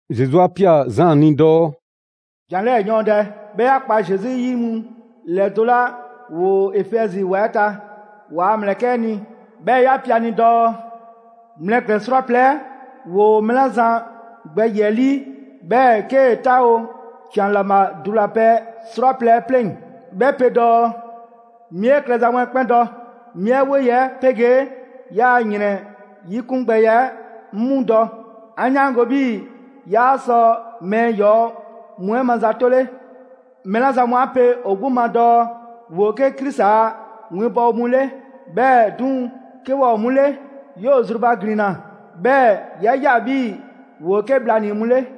Zesu 'a ꞊pia Zaan ni dɔɔ: «‑Jan 'lɛɛ‑ ‑yɔɔndɛ, 'bhɛɛ‑ 'ya kpa Zesu yi mu ‑lɛdo' 'la ‑woo Efɛzi ‑wa 'ɛ ta, ‑waa' ‑mlɛkɛ' 'ɛ ni, 'bhɛ 'ya pe a ni dɔɔ: Mlɛklɛn‑ 'srwaplɛ‑ 'ɛ ‑woo mɛɛ 'la zan gbɛ ‑yiɛ' 'ɛ 'lii, 'bhɛɛ‑ 'kee‑ 'taawo‑ ‑can ‑laŋbha dulapɛ 'srwaplɛ‑ 'ɛ 'pleŋ‑ 'bhɛ pe dɔɔ: 'Mi 'e klɛza mu 'ɛ 'kpɛn dɔ, 'mi 'e 'woye‑ 'ɛ 'pegee 'yaa‑ ‑yrɛn 'yikungbɛya 'ɛ 'ŋ 'mu dɔ. 'An 'yaango‑ 'bhii‑ 'yaa sɔ mɛɛ ‑yɔɔ' mu 'ɛ mazatole. Mɛɛ 'la zan mu 'a pe ‑o 'gbu ma dɔɔ ‑woo 'ke Krisi a winbɔwo mu 'le, 'bhɛɛ‑ 'duŋ‑, 'ke waa ‑o 'mu 'le, 'yoo‑ zrubaglinna, 'bhɛɛ‑ 'ya ꞊ya 'bhii‑ ‑woo 'ke bhlanii‑ mu 'le.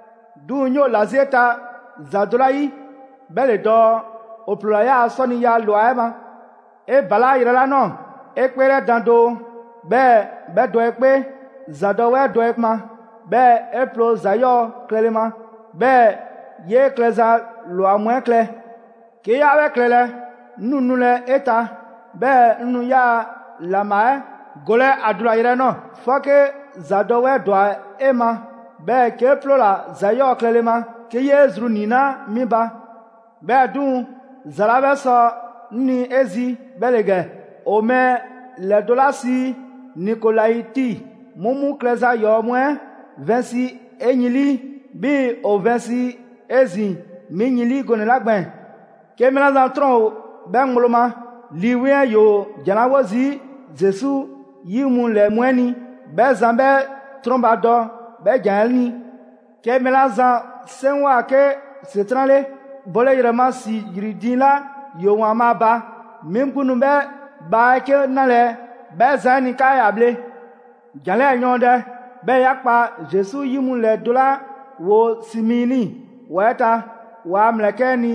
'Duŋ‑ 'ŋ 'yoo‑ ‑la 'zi 'e ta ‑za do 'la 'yi 'bhɛ ‑le dɔɔ: ‑o 'ploola‑ 'yaa‑ 'sɔniya ꞊lwa 'ɛ ma. 'E ‑balaa' yrɛ 'la ꞊nɔɔ, 'e 'kpeelɛdan doo, 'bhɛɛ‑ 'bhɛ dɔ 'e 'kpee. ‑Zadɔwɛɛ dɔ 'e ma, 'bhɛɛ‑ 'e ploo ‑za 'yɔɔ‑ klɛle ma; 'bhɛɛ‑ 'yee klɛza ‑lwa mu 'ɛ klɛ. 'Ke 'yaa 'bhɛ klɛlɛ, 'ŋ nu nulɛ 'e ta, 'bhɛɛ‑ 'ŋ nu 'yaa‑ ‑laŋbha 'ɛ golɛ ‑a dulayrɛ 'ɛ ꞊nɔɔ; 'fɔke ‑zadɔwɛɛ ‑dwa 'e ma, 'bhɛɛ‑ 'kee 'ploola‑ ‑za 'yɔɔ‑ klɛle ma 'ke 'yee‑ zru 'niinaa 'mi ba. 'Bhɛɛ‑ 'duŋ‑, ‑za 'la 'bhɛ sɔ 'ŋ ni 'e zi 'bhɛ ‑le ‑gɛ: ‑o mɛɛ ‑lɛdo' 'la sii Nikolaiti mu 'mu klɛza ‑yɔɔ mu 'ɛ vɛnsi 'e yin 'lii, 'bhii‑ ‑o vɛnsi 'ezin‑ 'mi yin 'lii gɔnɛ‑ 'la gbɛɛn‑. 'Ke mɛɛ 'la zan 'trɔn ‑o 'bhɛ ŋgblo ma, Lii 'Weŋ 'ɛ ‑yoo ‑jan 'la 'wo zii' Zesu 'yi mu ‑lɛ mu 'ɛ ni, 'bhɛ zan 'bhɛ 'trɔnbadɔ 'bhɛ ‑jan 'ɛ ni! 'Ke mɛɛ 'la zan 'seŋgwa‑ 'ke ‑Setran' 'le, bole ‑yrɛ ma ‑si ‑yri diiŋ 'la ‑yoo ‑Waanbhaa' ba, 'mi 'gbu nu 'bhɛ bhaa 'ɛ 'ke 'nalɛ‑ 'bhɛ zan 'ɛ ni 'kaa ‑ya bhle. «‑Jan 'lɛɛ‑ ‑yɔɔndɛ, 'bhɛɛ‑ 'ya kpa Zesu yi mu ‑lɛdo' 'la ‑woo Simiini ‑wa 'ɛ ta, ‑waa' ‑mlɛkɛ' 'ɛ ni,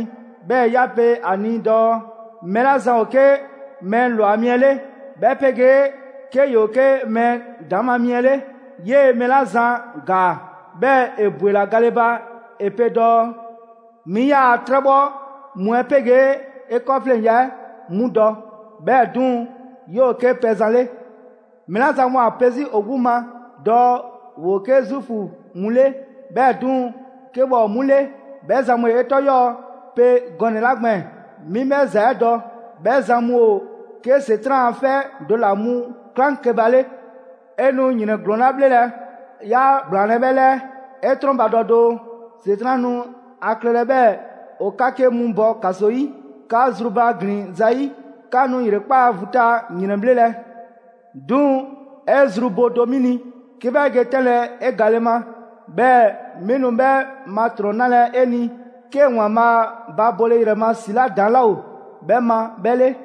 'bhɛɛ‑ 'ya pe a ni dɔɔ: Mɛɛ 'la zan ‑o 'ke mɛɛ ‑lwa mi 'ɛ 'le, 'bhɛ 'pegee 'ke ‑yoo 'ke mɛɛ ‑daŋ ma mi 'ɛ 'le, 'yee‑ mɛɛ 'la zan ‑gaa, 'bhɛɛ‑ ‑e ‑bwela gale ba, ‑e pe dɔɔ: 'Mi 'yaa‑ 'trɛbhɔ mu 'ɛ 'pegee 'e 'kɔɔfleŋya 'ɛ 'mu dɔ; 'bhɛɛ‑ 'duŋ‑, 'yoo‑ 'ke pɛzan 'le. Mɛɛ 'la zan mu ‑o ‑a pe 'zi ‑o 'gbu ma dɔɔ ‑woo 'ke Zuufu mu 'le, 'bhɛɛ‑ 'duŋ‑, 'ke waa ‑o 'mu 'le; 'bhɛ zan mu 'e 'tɔ 'yɔɔ‑ pe gɔnɛ‑ 'la gbɛɛn‑, 'mi 'bhɛ ‑za 'ɛ dɔ. 'Bhɛ zan mu ‑o 'ke ‑Setran' a 'fɛ do ‑la mu 'klaŋkeba 'le. 'E nu ‑yrɛn ‑glɔɔn 'la 'bhlelɛ‑, 'yaa ‑gblaanlɛ' 'bhɛ 'lɛɛ. 'E 'trɔnbadɔ doo! ‑Setran' nu ‑a klɛlɛ 'bhɛɛ‑ ‑o 'ka 'ke mu bɔ ‑kaso 'yi, 'ka zrubaglin zayi'. 'Ka nu ‑yrekpaa' vu ta ‑yrɛnbhlelɛ. 'Duŋ‑ 'e zru bo do 'mi ni, 'ke 'bhɛ ge 'tɛnlɛ‑ 'e gale ma; 'bhɛɛ‑ 'mi nu 'bhɛ ma ‑trɔn 'nalɛ‑ 'e ni 'ke ‑Waanbhaa' ba bole ‑yrɛ ma ‑si 'la ‑daŋ' 'laa ‑o 'bhɛ ma 'bhɛ 'le.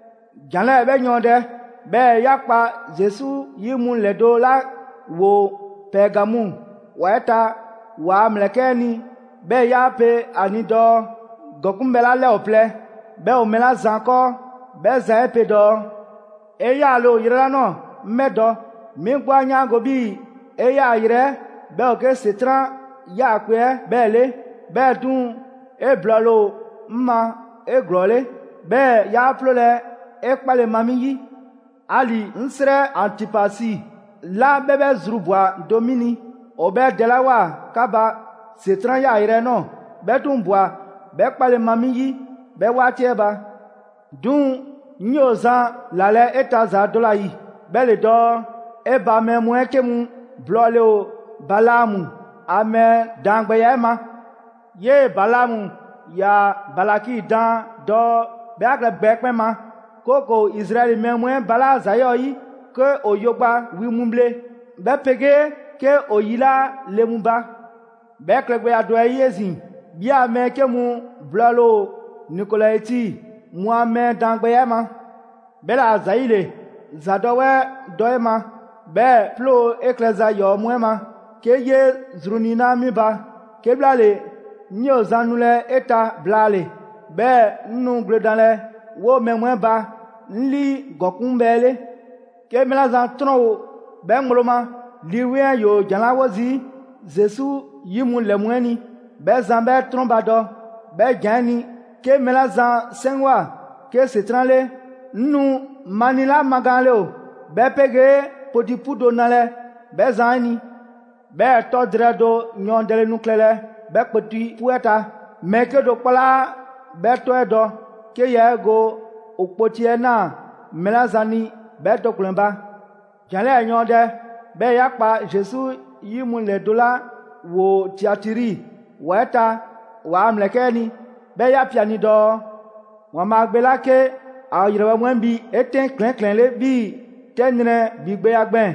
«‑Jan 'lɛɛ‑ 'bhɛ yɔɔndɛ, 'bhɛɛ‑ 'ya kpa Zesu 'yi mu ‑lɛdo' 'la ‑woo Pɛɛgamu ‑wa 'ɛ ta ‑waa' ‑mlɛkɛ' 'ɛ ni, 'bhɛɛ‑ 'ya pe a ni dɔɔ: ‑Gɔkuŋbhɛ 'la 'lɛ ‑o plɛ 'bhɛ ‑o mɛɛ 'la zan 'kɔɔ, 'bhɛ zan 'ɛ pe dɔɔ: 'E 'yaale‑ ‑o yrɛ 'la ꞊nɔɔ 'ŋ 'bhɛ dɔ. 'Mi 'gbu 'a 'yaango‑ 'bhii‑ 'e 'yaayrɛ‑ 'ɛ 'bhɛ ‑o 'ke ‑Setran' 'yaakpe‑ 'ɛ 'bhɛɛ‑ 'le. 'Bhɛɛ‑ 'duŋ‑, 'e blɔɔle ‑o 'ŋ ma 'eglɔɔle, 'bhɛɛ‑ 'yaa 'ploolɛ‑ 'e 'kpale‑ ma 'mi 'yi. 'Ali‑ 'ŋ 'srɛ Antipasi 'la 'bhɛ 'bhɛ zru ꞊bwa do 'mi ni, ‑o 'bhɛ dɛlawoa 'ka ba ‑Setran' 'yaayrɛ 'ɛ ꞊nɔɔ; 'bhɛ 'duŋ‑ ꞊bwa 'bhɛ 'kpale‑ ma 'mi 'yi 'bhɛ 'waati 'ɛ ba. 'Duŋ‑ 'ŋ 'yoo‑ zan ‑lalɛ' 'e ta ‑za do ‑la ‑yi, 'bhɛ ‑le dɔɔ: 'e ba mɛɛ mu 'ɛ 'ke mu blɔɔle ‑o Balaamu ‑a mɛɛ daangbɛya 'ɛ ma. 'Yee‑ Balaamu ‑yaa Balaki daan dɔɔ 'bhɛ 'a klɛ gbɛ 'ɛ 'kpɛn ma, 'kooko‑ Izraɛli mɛɛ mu 'ɛ balaa' ‑za 'yɔɔ‑ 'yi 'ke ‑o yo gba wi mu bhle, 'bhɛ 'pegee 'ke ‑o yilaa' le mu ba. 'Bhɛ klɛgbɛya do 'ɛ 'yi 'ezin‑, 'bhi a mɛɛ 'ke mu blɔɔle ‑o Nikolaiti mu a mɛɛ daangbɛya 'ɛ ma. 'Bhɛla‑ ‑zayile, ‑zadɔwɛɛ dɔ 'e ma, 'bhɛɛ‑ 'ploo‑ 'e klɛza ‑yɔɔ' mu 'ɛ ma 'ke 'yee zru niinaa' 'mi ba. 'Kebhlaale, 'ŋ 'yoo‑ zan nulɛ 'e ta blaale, 'bhɛɛ‑ 'ŋ nu gwledanlɛ 'woo‑ mɛɛ mu 'ɛ ba 'ŋ 'lii ‑gɔkuŋbhɛ 'ɛ 'le. 'Ke mɛɛ 'la zan 'trɔn ‑o 'bhɛ ŋgblo ma, Lii 'Weŋ 'ɛ ‑yoo ‑jan 'la 'wo zii' Zesu 'yi mu ‑lɛ mu 'ɛ ni, 'bhɛ zan 'bhɛ 'trɔnbadɔ 'bhɛ ‑jan 'ɛ ni! 'Ke mɛɛ 'la zan 'seŋgwa‑ 'ke ‑Setran' 'le, 'ŋ nu mani 'la magaanle ‑o, 'bhɛ 'pegee kpoti 'pu do nalɛ 'bhɛ zan 'ɛ ni; 'bhɛɛ‑ 'tɔ drɛɛ do yɔɔndɛle nu klɛlɛ 'bhɛ kpoti 'pu 'ɛ ta. Mɛɛ 'kedo‑ 'kpɔ 'laa 'bhɛ 'tɔ 'ɛ dɔ, 'ke yaa 'e go ‑o kpoti 'ɛ ꞊naa mɛɛ 'la zan ni 'bhɛ do ‑kplɛn ba. «‑Jan 'lɛɛ‑ yɔɔndɛ, 'bhɛɛ‑ 'ya kpa Zesu 'yi mu ‑lɛdo' 'la ‑woo Tiatiri ‑wa 'ɛ ta ‑waa' ‑mlɛkɛ' 'ɛ ni, 'bhɛɛ‑ 'ya pe a ni dɔɔ: ‑Waanbhaa' Gbe 'la 'ke ‑a ‑yrɛbhɛ' mu 'ɛ bhi 'etɛn ‑klɛɛn' ‑klɛɛnle' 'bhii‑ 'tɛ nrɛ ‑bhigbɛya gbɛɛn‑,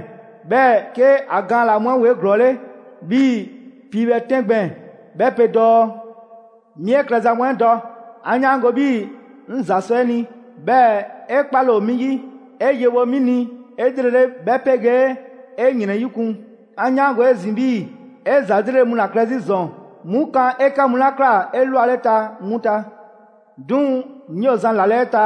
'bhɛɛ‑ 'ke ‑a gaan ‑laa mu 'ɛ ‑woo 'eglɔɔle 'bhii‑ piibhɛ 'tɛn gbɛɛn‑, 'bhɛ pe dɔɔ: 'Mi 'e klɛza mu 'ɛ dɔ; 'an 'yaango‑ 'bhii‑ 'ŋ ‑za sɔ 'e ni, 'bhɛɛ‑ 'e 'kpale‑ ‑o 'mi 'yi, 'e yewo 'mi ni 'elrele 'bhɛ 'pegee 'e ‑yrɛnyikun. 'An 'yaango‑ 'ezin‑ 'bhii‑ 'e ‑za 'lrele‑ mu 'la klɛ 'zi ‑zɔn 'mu kan 'e 'kɛ mu 'la ꞊kla 'elwaleta 'mu ta. 'Duŋ‑ 'ŋ 'yoo‑ zan ‑lalɛ' 'e ta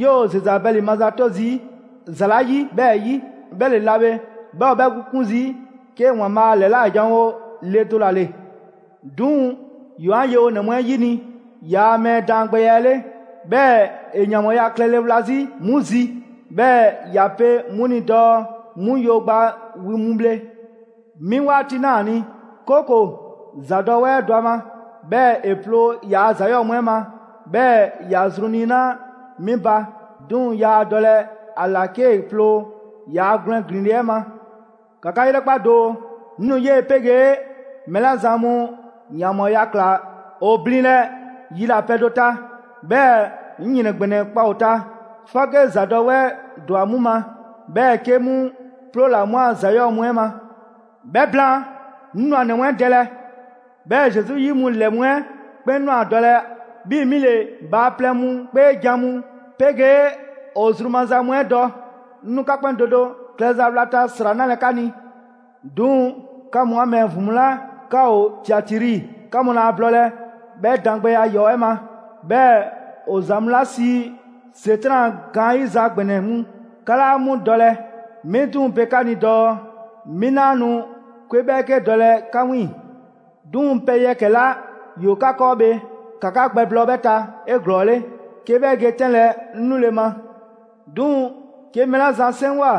'yoo‑ Zezabɛli mazato zii' ‑za 'la 'yi 'bhɛɛ‑ 'yi. 'Bhɛ le 'la bhe 'bhɛ ‑o 'bhɛ 'gbu 'kun zii' 'ke ‑Waanbhaa' a ‑lɛla' ‑janwo' le do ‑la ‑le. 'Duŋ‑ ‑yoo 'an yewonɛ mu 'ɛ 'yini‑ ‑yaa' mɛɛ daangbɛya 'ɛ 'le, 'bhɛɛ‑ ‑e ‑yanbhɔɔya klɛle wla 'zi 'mu zi; 'bhɛɛ‑ ‑ya pe 'mu ni dɔɔ 'mu yo gba wi mu bhle. 'Mi 'waati ꞊naa ‑a ni, 'kooko‑ ‑zadɔwɛɛ dɔ ‑a ma, 'bhɛɛ‑ ‑e 'ploo‑ ‑yaa' ‑za 'yɔɔ‑ mu 'ɛ ma, 'bhɛɛ‑ ‑ya zru niinaa' 'mi ba; 'duŋ‑ yaa dɔlɛ ‑a ‑la 'kee‑ ploo ‑yaa' gwlɛn ‑glinle' 'ɛ ma. ‑Ka 'ka 'yrɛkpa doo, 'ŋ nu 'yee‑ 'pegee mɛɛ 'la zan mu ‑yanbhɔɔya ꞊kla ‑o blinlɛ yilapɛ do ta, 'bhɛɛ‑ 'ŋ ‑yrɛn ‑gbɛnɛ kpa ‑o ta, 'fɔke ‑zadɔwɛɛ ‑dwa 'mu ma, 'bhɛɛ‑ 'ke 'mu ‑ploola 'mu a ‑za 'yɔɔ‑ mu 'ɛ ma. 'Bhɛ blaan, 'ŋ nu ‑a ‑nɛ mu 'ɛ dɛlɛ. 'Bhɛɛ‑ Zesu 'yi mu ‑lɛ mu 'ɛ 'kpɛn nu a dɔlɛ 'bhii‑ 'mi ‑le bhaaplɛŋ mu 'kpeejan‑ mu 'pegee ‑o zru maza mu 'ɛ dɔ. 'Ŋ nu 'ka 'kpɛn do do klɛza wlata ‑sra 'nalɛ‑ 'ka ni. 'Duŋ‑, 'ka mu 'an mɛɛ ‑vin mu 'la 'ka ‑o Tiatiri, 'ka mu laa blɔɔlɛ 'bhɛ daangbɛya 'yɔɔ‑ 'ɛ ma. 'Bhɛɛ‑ ‑o ‑za mu 'la sii ‹‑Setran' a gaanyiza ‑gbɛnɛ mu.› 'Ka 'laa 'mu dɔlɛ. 'Mi 'duŋ‑ pe 'ka ni dɔɔ, 'mi 'naa nu 'kwe 'bhɛɛke dɔlɛ 'ka 'wiiŋ‑. 'Duŋ‑, pɛ yɛkɛ‑ 'la ‑yoo 'ka 'kɔɔ bhe, ‑ka 'ka gbɛblɔɔ 'bhɛ ta 'eglɔɔle, 'ke 'bhɛ ge 'tɛnlɛ‑ 'ŋ 'nule‑ ma. 'Duŋ‑, 'ke mɛɛ 'la zan 'seŋgwa‑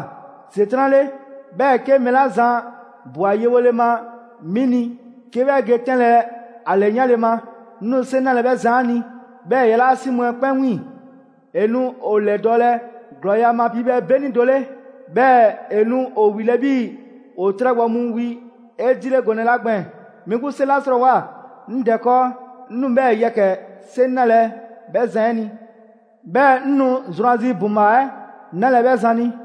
‑Setran' 'le, 'bhɛɛ‑ 'ke mɛɛ 'la zan ꞊bwa yewole ma 'mi ni 'ke 'bhɛ ge 'tɛnlɛ‑ ‑a ‑lɛyanle ma, 'ŋ nu 'seŋ 'nalɛ‑ 'bhɛ zan 'ɛ ni, 'bhɛɛ‑ ‑e yalaa' 'si mu 'ɛ 'kpɛn 'wiiŋ‑. ‹‑E nu ‑o ‑lɛdɔɔlɛ ‑glɔɔya' ma piibhɛ 'beni do 'le; 'bhɛɛ‑ ‑e nu ‑o ‑wilɛ' 'bhii‑ ‑o 'trɛ gbɔ mu wi 'edile gɔnɛ‑ 'la gbɛɛn‑.› 'Mi 'gbu 'seŋ 'la 'srɔɔwoa‑ 'ŋ Dɛ 'kɔɔ, 'ŋ nu 'bhɛɛ‑ yɛkɛ‑ 'seŋ 'nalɛ‑ 'bhɛ zan 'ɛ ni. 'Bhɛɛ‑ 'ŋ nu zrwanzi ‑buŋbhaa 'ɛ 'nalɛ‑ 'bhɛ zan ni.